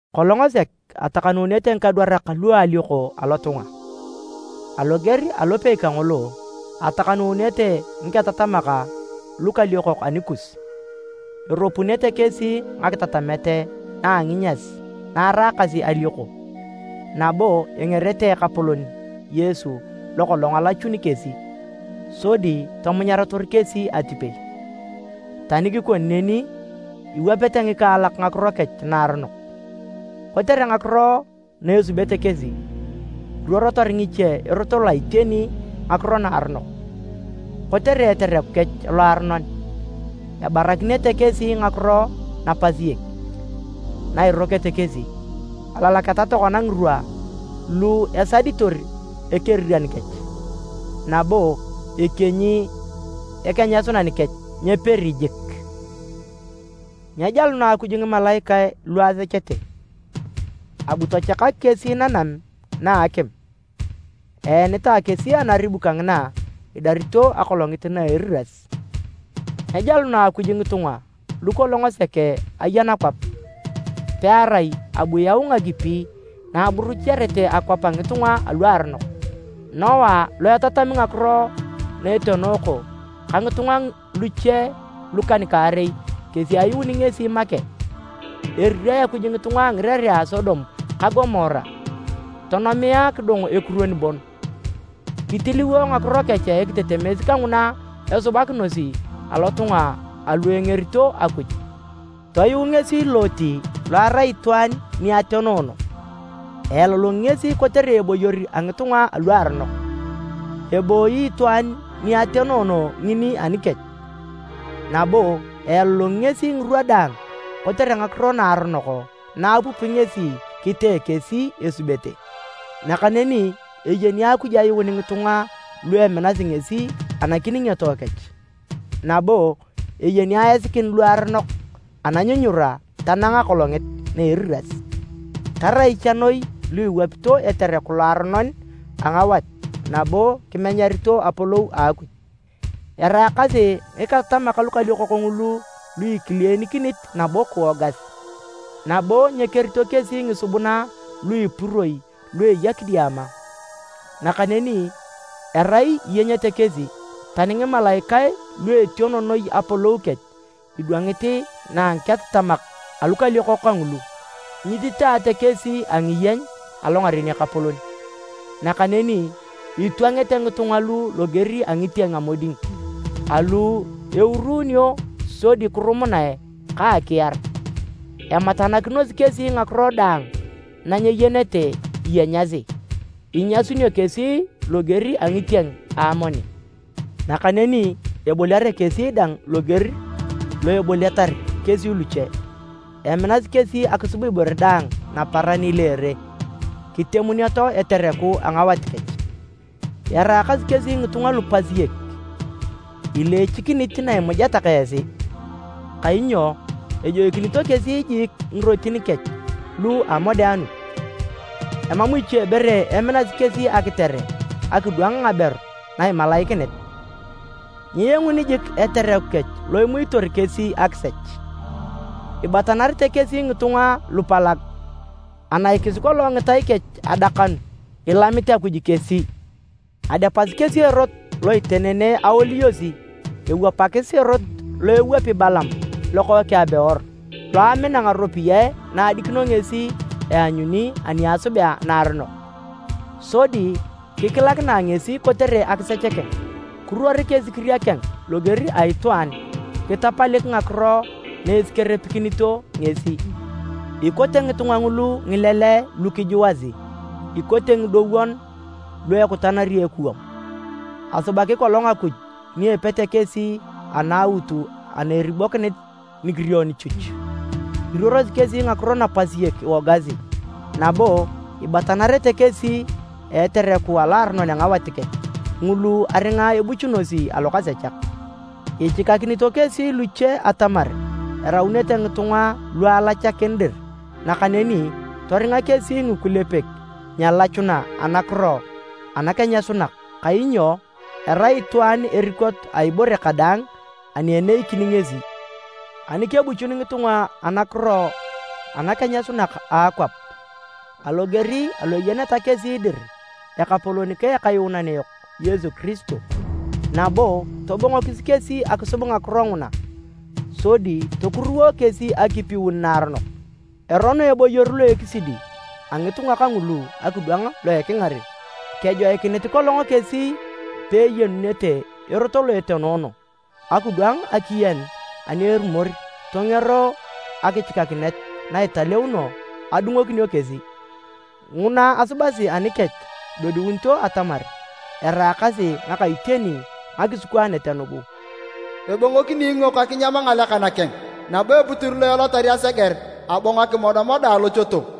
Kolong sek atakanuunete ngikadwarak lu a alioko alotunga. Aloger alopei kangolo, etakanuunete ngiketatamak lukaliokok anikus. Eropunete kesi ngakitatamet na a nginyas na eraakasi alioko, nabo engerete Ekapolon Yesu lo kolong alachuni kesi, sodi tomunyarator kesi atipei. Tani kikoni neni, iwapete ngikaalak ngakiro kech naaronok. Kotere ngakiro na esubete kesi, iruorotor ngiche Erot loa iteni ngakiro naaronok. Kotere etereku kech loaronon, ebarakinete kesi nakiro napasiek na irokete kesi. Alalaketa tokona ngirwa lu esaditor Ekeriran kech, nabo ekienyi Ekenyasunan kech nyeperi jik! Nyejaluna Akuj ngimalaikae lu asechete, abu tachakak kesi nanam na akim, eenitae kesi anaribu kangina idarito Akolongit na Eriras. Nyejaluna Akuj ngitunga lu kolong sek aya nakwap, pearai abu yau ngakipi na aburuchiarete akwap a ngitunga aluaronok. Noa lo etatami ngakiro na etenooko ka ngitunga luche lukan-kaarei kesi ayuuni ngesi make. Erirae Akuj ngitunga a ngirerea a Sodom ka Gomora, tonomia kidong ekuruon bon. Kitiliwo ngakiro kech ekitetemes kanguna esubakinosi alotunga alu engerito Akuj. Toyuu ngesi Loti lo arai itwaan etenoono. Ealolongi ngesi kotere eboyor a ngitunga aluaronok. Ebooyi itwaan ni atenoono ngini anikech, nabo ealolongi ngesi ngirwa daang kotere ngakiro naaronok na apupi ngesi kitee kesi esubete. Nakaneni eyeni Akuj ayuun ngitunga lu eminasi ngesi anakiningioto kech nabo eyeni aisikin luaronok ananyunyura tanang Akolongit na Eriras, tarai cha noi lu iwapito etereku loaronon a ngawat nabo kimenyarito apolou a Akuj. Eraakasi ngiketatamak lukaliokok ngulu lu ikileenikinit nabo kiwogas, nabo nyekerito kesi ngisubuna lu ipuroi lu eya kidiama, nakaneni erai iyenyete kesi. Tani ngimalaikae lu etiono noi apolou kech idwangit na a ngiketatamak alukaliokok kangulu, nyititaate kesi a ngiyeny alongaren Ekapolon. Nakaneni itwangete ngitunga lu loger a ngitieng a moding, alu eurunio sodi kirumunae ka akiar, ematanakinosi kesi ngakiro daang na nyeyenete iyenyasi. Inyasunio kesi loger a ngitieng a amoni, nakaneni eboliare kesi dang loger lo eboliatar kesi luche. Eminasi kesi akisub ibore daang naparan ileere, kitemuneto etereku a ngawat kech. Eraakasi kesi ngitunga lupasiek ileechikinit na imujeta ka esi, kainyo ejoikinito kesi jiik ngirotin kech lu a amodeanut! Emam ichebore eminasi kesi akitere akidwang ngaberu na imalaikinit, nyienguni jik etereku lo imuitor kesi akisech. Ibatanarete kesi ngitunga lupalag. Anaikis kolong ngitai kech adakanu. Ilamit Akuj kesi! Adepasi kesi erot lo itenene awoliyosi, ewapakis erot lo ewapi Balaam lokookeng a Beor, lo amina ngaropiyae na adikino ngesi eanyuni ani esubea naaronok sodi kikilakinae ngesi kotere akisech keng. Kiruorik esikiria keng loger a itwaan kitapalik ngakiro na esikerepikinito ngesi. Ikote ngitunga ngulu ngileleae lu kijuasi, ikote ngidowon lu ekutanari ekuwam. Asubaki kolong Akuj ni epete kesi anaaut ana eribokinit nikirion chuch. Iruorosi kesi ngakiro napasiek iwogasi, nabo ibatanarete kesi a etereku aloaronon a ngawat kech, ngulu aringa ebuchunosi alokasechak. Ichikakinito kesi luche atamar eraunete ngitunga lu alachakin dir nakaneni toringa kesi ngikulepek nyelachuna anakiro anakenyasunak, kainyo erai itwaan erikot a ibore kadaang ani eneikin ngesi. Ani kebuchun ngitunga anakiro anakenyasunak a akwap, aloger alo eyeneta kesi dir Ekapolon ka Ekayuunan yok Yesu Kiristo, nabo tobongokis kesi akisub ngakiro nguna sodi tokuruwo kesi akipiun naaronok, erono eboyor lo ekisidi a ngitunga kangulu akidwang lo ekingaren. Kejoikinit kolong kesi peeyenunete erot lo etenoono, akidwang akiyen ani erumor tongero akichikakinet na italeuno adungokinio kesi. Nguna asubasi anikech idodiunito atamar eraakasi ngaka iteni ngakisikwaanet nugu, “Ebongokini iingok akinyam ngalekan keng,” nabo, “Eputir lo elotar aseger, abongo akimodamoda alochoto.”